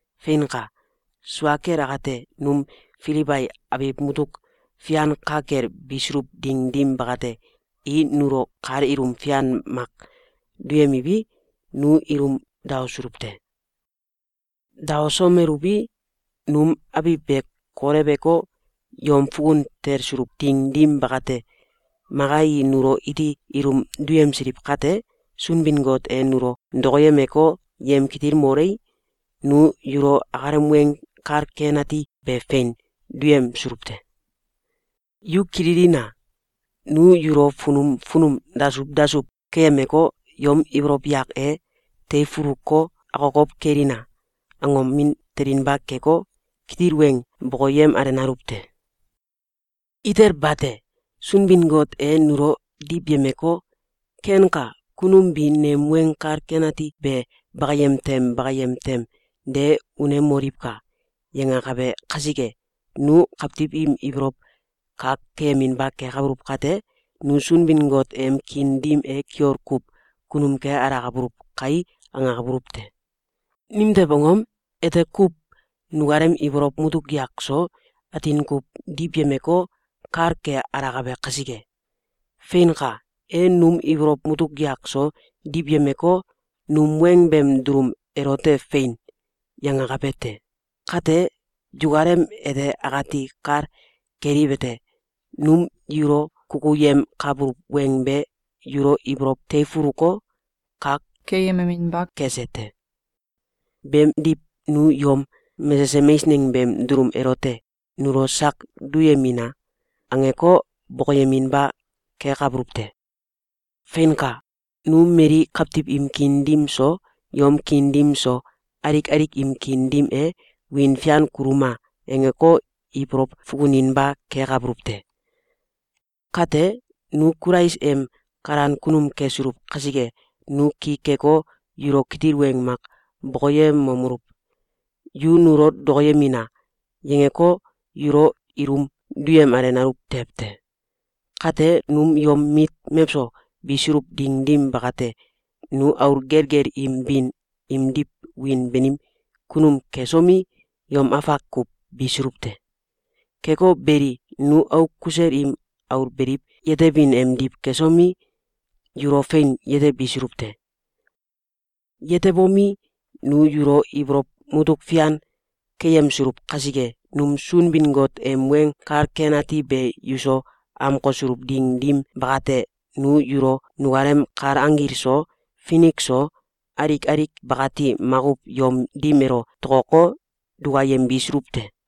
Feinka! Sua kel akate, num Filibai abiw mutuk fian ka kel bisuluw ding dim bakate, i nulo kal ilum fian mak duyemiwi, nu ilum daosuluw te. Daosomeluwi, num abiw be koleweko, yom fukun talsuluw ding dim bakate, maka i nulo iti ilum duyemsiliw kate, Sunbin-Got e nulo dokoyemeko, yemkitilmolei, nu yulo akalem Weng Kal Ken Ati be fein duyemsuluw te. Yu kililina! Nu yulo funum funum dasuw dasuw keyemeko, yom ibolow yak e “Teifuluko akokow kelina!”, angomin telinba keko, kitil weng bokoyemalenaluw te! Itel bate! Sunbin-Got e nulo diwyemeko, “Kenka! Kunum bi nem Weng Kal Ken Ati be bakayem tem bakayem tem de unemoliwka!”, yangakabe kasike, nu kawtiw im ibolow kak keyeminba kekabuluw kate, nu “Sunbin-Got em kiin dim e kiol kuw kunum ke alakabuluw kae!”, angakabuluw te. Nimtew angom? Ete kuw nukalem ibolow mutuk yak so atin kuw diwyemeko, kal ke alakabe kasike. Feinka! E num ibolow mutuk yak so diwyemeko, num weng beem dulum elote “Fein!”, yangakabe te. Kate, yukalem ete akati kal keliwete: Num yulo kukuyemkabuluw weng be yulo ibolow teifuluko, kak keyememeinba kese te. Beemdiw, nu yom mesesem eisneng beem dulum elote “Nulo sak duyemina!”, angeko, bokoyeminba kekabuluw te. Feinka! Nu mali kawtiw im kiin dim so, yom kiin dim so, alik alik im kiin dim e “Wiin fian kuluma!”, angeko, ibolow fukuninba kekabuluw te. Kate, nu Kulais em kalan kunum kesuluw kasike, nu ki keko, yulo kitil weng mak bokoyemomeluw: “Yu nulo dokoyemina!”, yangeko, yulo ilum duyemalenaluw tew te. Kate, num yom mit mewso bisuluw ding dim bakate, nu aul gelgel im bin imdiw wiin banim kunum kesomi, yom afak kuw bisuluw te. Keko beli, nu auk kusel im aul beliw yetebin emdiw kesomi, yulo fein yetebisuluw te. Yetebomi, nu yulo ibolow mutuk fian keyemsuluw kasike, num Sunbin-Got em Weng Kal Ken Ati be yuso amkosuluw ding dim bakate, nu yulo nukalem kal anggil so, finik so, alik alik bakati makuw yom dim elo tokoko, dukayembisuluw te.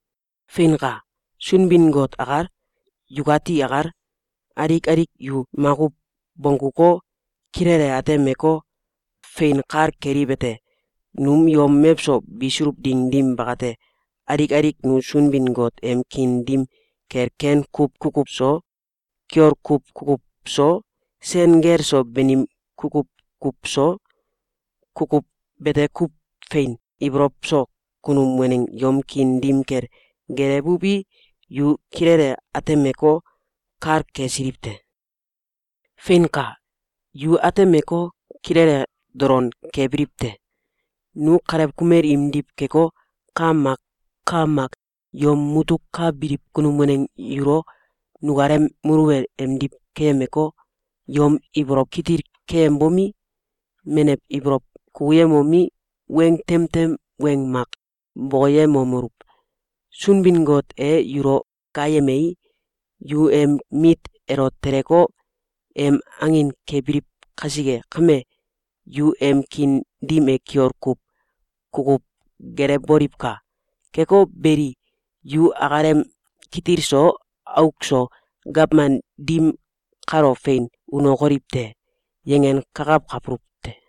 Feinka! Sunbin-Got akal, yukati akal, alik alik yu makuw bongguko, kilele atemeko, fein kal keliwete: Num yom mewso bisuluw ding dim bakate, alik alik nu Sunbin-Got em kiin dim kel ken kuw kukuw so, kiol kuw kukuw so, sen gel so banim kukuw kuw so, kukuw bete kuw fein ibolow so kunum waneng yom kiin dim kel gelewuwi, yu kilele atemeko, kal kesiliw te. Feinka! Yu atemeko, kilele dolon kebiliw te! Nu kalew kumel imdiw keko, ka mak ka mak yom mutuk ka biliw kunum waneng yulo nukalem muluwel emdiw keyemeko, yom ibolow kitil keyembomi, menew ibolow kukuyemomi, weng tem tem weng mak bokoyemomeluw: “Sunbin-Got e yulo gaayemei, yu em mit elo teleko, em angin kebiliw kasike kame, yu em kiin dim e kiol kuw kukuw gelewboliwka! Keko beli, yu akalem kitil so auk so gawman dim kalo fein unokoliw te.”, yangenkakawkabuluw te.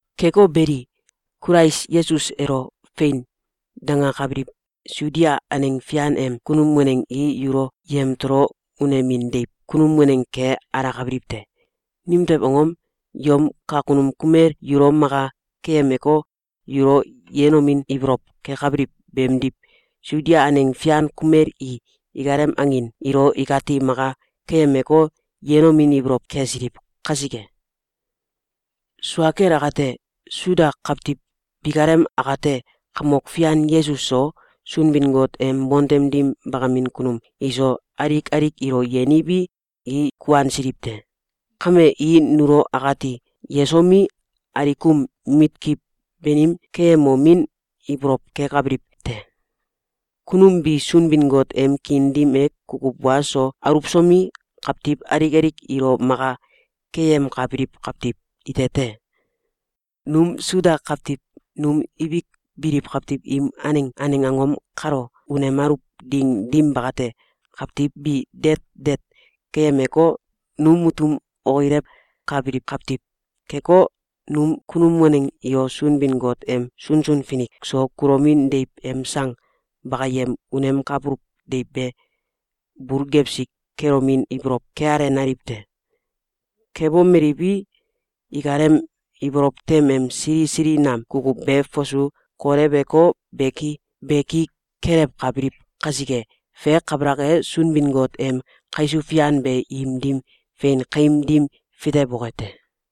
Keko beli, Kulais Yesus elo “Fein!”, dangakabiliw Sudia aneng fian em kunum waneng i yulo yamtolo unemin deiw kunum waneng ke alakabiliw te. Nimtew angom? Yom kakunum kumel yulo maka keyemeko, yulo yenomin ibolow kekabiliw beemdiw, Sudia aneng fian kumel i ikalem angin ilo ikati maka keyemeko, yenomin ibolow kesiliw kasike. Sua kel akate, Suda kawtiw bikalem akate Kamok Fian Yesus so, Sunbin-Got em bontem dim bakamin kunum iso, alik alik ilo yeniwi, i kuansiliw te. Kame, i nulo akati yesomi, alikum mitkiw banim keyemomin ibolow kekabiliw te. Kunum bi Sunbin-Got em kiin dim e kukuw wa so aluwsomi, kawtiw alik alik ilo maka keyemkabiliw kawtiw ite te. Num Suda kawtiw num ibik biliw kawtiw im aneng aneng angom kalo unemaluw ding dim bakate, kawtiw bi deet deet keyemeko, num mutum okilewkabiliw kawtiw keko, num kunum waneng ilo Sunbin-Got em sunsun finik so kulomin deiw em sang bakayem unemkabuluw deiw be bul gewsi kelomin ibolow kealenaliw te. Kebomeliwi, ikalem ibolow tem em sili sili nam kukuw be fasu koleweko, beki beki kelewkabiliw kasike, fe kabalak e, Sunbin-Got em kaisuw fian be im dim fein kaim dim fitewoke te.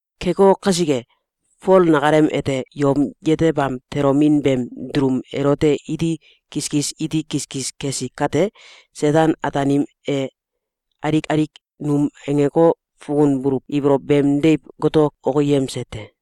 Keko kasike, Fol nakalem ete yom yetebam tolomin beem dulum elote iti kiskis iti kiskis kesi kate, Seten-Ataanim e alik alik num angeko, fukunbuluw ibolow beem deiw goto okiyemse te.